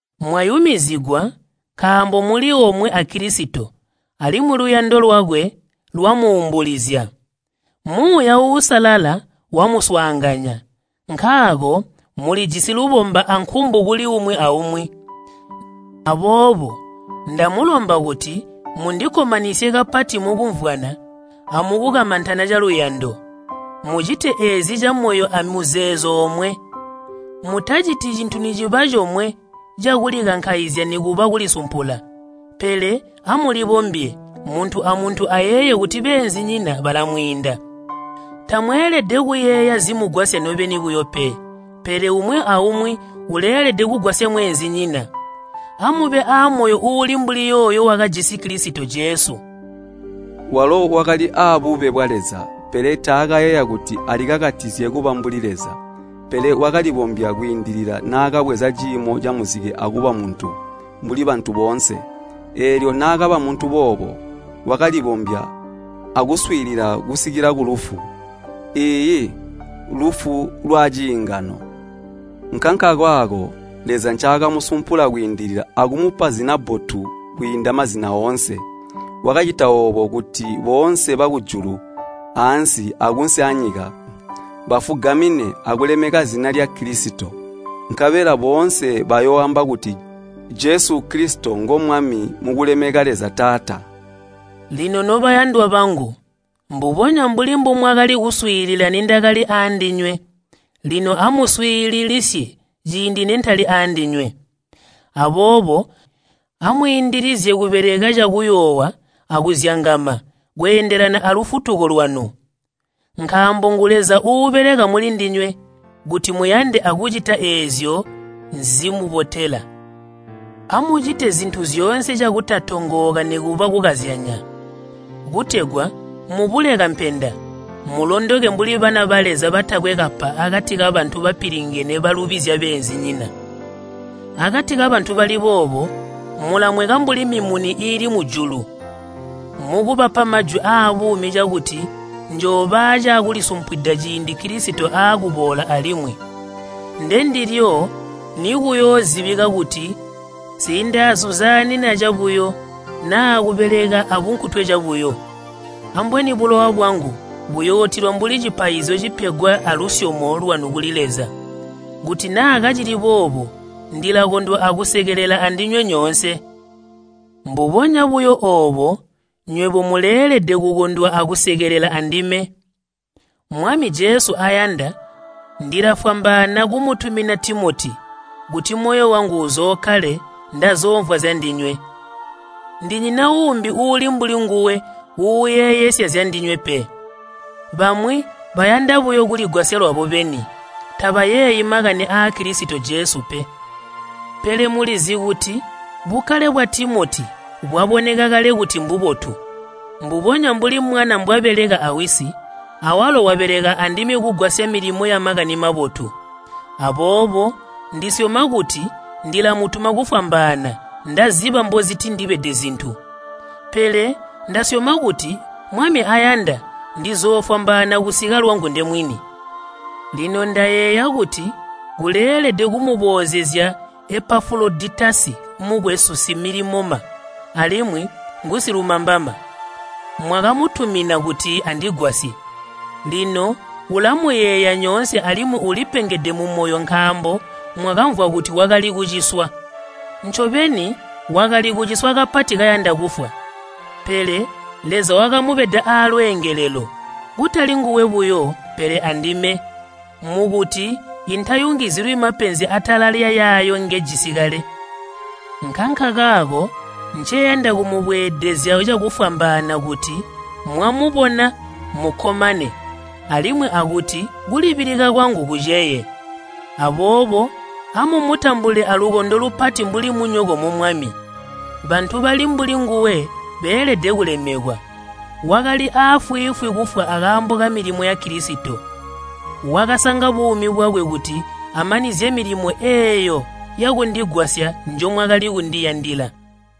Mwayumizigwa nkaambo muli omwe a Kilisito alimwi luyando lwakwe lwamuumbulizya. Muuya Uusalala wamuswaanganya, nkaako mulijisi lubomba ankumbu kuli umwi aumwi. Aboobo ndamulomba kuti mundikkomanisye kapati mukumvwana amukukamantana caluyando. Mucite eezi camoyo amuzeezo omwe. Mutaciti cintu niciba comwe cakulikankaizya nikuba kulisumpula, pele amulibombye, muntu amuntu ayeeye kuti beenzinyina balamwiinda. Tamweelede kuyeeya zimugwasya nobeni buyo pe, pele umwi aumwi uleelede kugwasya mweenzinyina. Amube aamoyo uuli mbuli yooyo wakajisi Kilisito Jesu. Walo wakali aabube bwa Leza, pele taakayeeya kuti alikakatizye kuba mbuli Leza. Pele wakalibombya kwiindilila naakabweza ciimo camuzike akuba muntu mbuli bantu boonse. Eelyo naakaba muntu boobo, wakalibombya akuswiilila kusikila kulufu, iiyi, lufu lwaciingano. Nkankakaako Leza ncaakamusumpula kwiindilila akumupa zina bbotu kwiinda mazina oonse. Wakacita oobo kuti boonse bakujulu, aansi akunsi anyika, bafugamine akulemeka zina lya Kilisito. Nkabela boonse bayooamba kuti Jesu Kilisito Mwami mukulemeka Leza Taata. Lino nobayandwa bangu, mbubonya mbuli mbumwakali kuswiilila nindakali aandinywe, lino amuswiilisisye ciindi nentali aandinywe. Aboobo amwiindilizye kubeleka cakuyoowa akuzyangama kweendelana alufutuko lwanu. Nkaambo ngu Leza uubeleka mulindinywe kuti muyande akucita eezyo zimubotela. Amucite zintu zyoonze cakutatongooka nikuba kukazyanya, kutegwa mubule kampenda, mulondoke mbuli bana ba Leza batakwe kapa akati kabantu bapilingene balubizya beenzinyina. Akati kabantu bali boobo mulamweka mbuli mimuni iili mujulu mukubapa majwi aabuumi cakuti njooba aacakulisumpwida ciindi Kilisito aakuboola alimwi. Ndendilyo nikuyoozibika kuti nsindaazuzaanina cabuyo naa kubeleka abunkutwe cabuyo. Ambweni bulowa bwangu buyootilwa mbuli cipaizyo cipegwa alusyomo lwanu kuli Leza. Kuti naa kacili boobo ndilakondwa akusekelela andinywe nyoonse. Mbubonya buyo oobo nywebo muleelede kukondwa akusekelelela andime. Mwami Jesu ayanda ndilafwambaana kumutumina Timoti, kuti moyo wangu uzookkale ndazoomvwa zyandinywe. Ndinyina uumbi uuli mbuli nguwe uuyeeyesya zyandinywe pe. Bamwi bayanda buyo kuligwasya lwabo beni, tabayeeyi makani aa Kilisito Jesu pe. Pele mulizi kuti bukkale bwa Timoti bwaboneka kale kuti mbubotu. Mbubonya mbuli mwana mbwabeleka awisi, awalo wabeleka andime kugwasya milimo ya Makani Mabotu. Aboobo ndisyoma kuti ndilamutuma kufwambaana, ndaziba mbozitindibede zintu. Pele ndasyoma kuti, Mwami ayanda, ndizoofwambaana kusika lwangu ndemwini. Lino ndayeeya kuti kuleelede kumuboozezya Epafuloditasi mukwesu similimoma alimwi ngusilumambama. Mwakamutuma kuti andigwasye. Lino ulamuyeeya nyoonse alimwi ulipengede mumoyo nkaambo mwakamvwa kuti wakali kuciswa. Ncobeni wakali kuciswa kapati kayanda kufwa. Pele Leza wakamubeda aalweengelelo, kutali nguwe buyo pele andime, mukuti intayungizilwi mapenzi atala lyayaayo ngejisi kale. Nkankakaako nceyanda kumubweedezya cakufwambaana kuti mwamubona mukkomane alimwi akuti kulibilika kwangu kuceye. Aboobo amumutambule alukondo lupati mbuli munyoko mu Mwami, bantu bali mbuli nguwe beelede kulemekwa. Wakali aafwiifwi kufwa akaambo kamilimo ya Kilisito. Wakasanga buumi bwakwe kuti amanizye milimo eeyo yakundigwasya njomwakali kundiyandila.